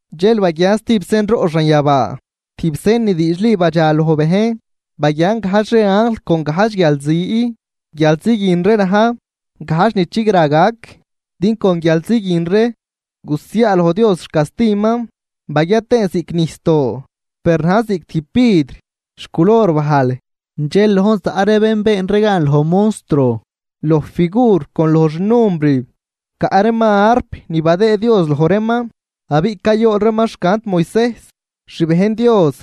Dxel baguian stijb senroꞌ xanyabaa, tijb sen ni diidxli badxaloj bejn: Baguian gajdx ree anjl con gajdx guialzi. Guialzi guin ree na̱j gajdx ni chigra gac din con guialzi guin ree gusiaaloj Dios xcastiman. Baguia tëën ziꞌc nijsdoo, per najn ziꞌc tijb vidr xculor bajl. Dxel lojn zaꞌ ree bén been ree gan loj monstruo, loj figur con loj xnumbrib, caꞌ reeman arp ni badëëd Dios loj reeman. Abiꞌ cayool reeman xcant Moisejs xbejn Dios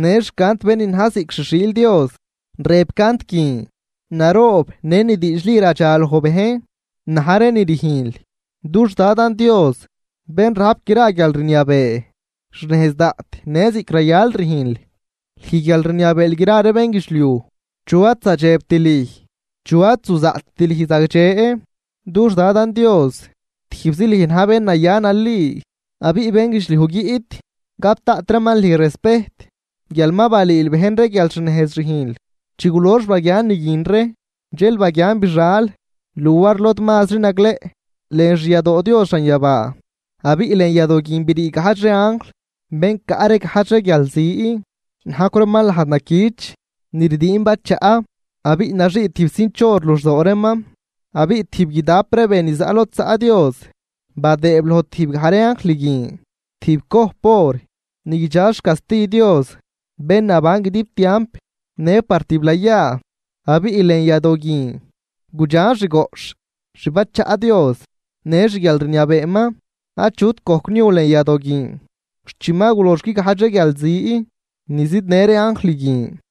në xcant bén ni na̱j ziꞌc xi xiil Dios, rëb cant guin: Naroob në ni diidxli radxaloj bejn na̱j ree ni rüjnl, dux Dadan Dios Bén rajp gra guialrniabee. Xnejz daꞌt në ziꞌc rayal rüjnl, lüj guial rniabeel gra ree bénguidxliuj. ¿Chu ad zadxebt lüj? ¿Chu ad zuzaꞌtt lüj zagdxe, dux Dadan Dios? Tijbzi lüj na̱j bén naya nali abiꞌ bénguidxliuj guiꞌt gap daꞌt reeman lüj respejt guial ma balüül bejn ree guial xnejz rüjnl. Chi gulox baguian ni guin ree, dxel baguian bixal luar lod mazri nagleꞌ lën xyadoo Dios xanyabaa. Abiꞌ lën yadoo guin brii gajdx ree anjl bén caꞌ ree gajdx ree guialzi, najcw reeman lajd naquich ni rdiin bachaꞌ, abiꞌ naxii tijb cinch or luxdoo reeman. Abiꞌ tijb guidap ree be ni zaꞌ lod zaꞌ Dios, badëëb loj tijbgaj ree anjl guin tijb cojp or ni guidxa xcasti Dios bén naban guidib tiamp në par tiblayaa. Abiꞌ lën yadoo guin gudxan xgoꞌxh xbachaꞌ Dios në xguialrniabeeman. Achut gojc niu lën yadoo guin xt chi ma gulox guigajdx ree guialzi ni zidnë ree anjl guin.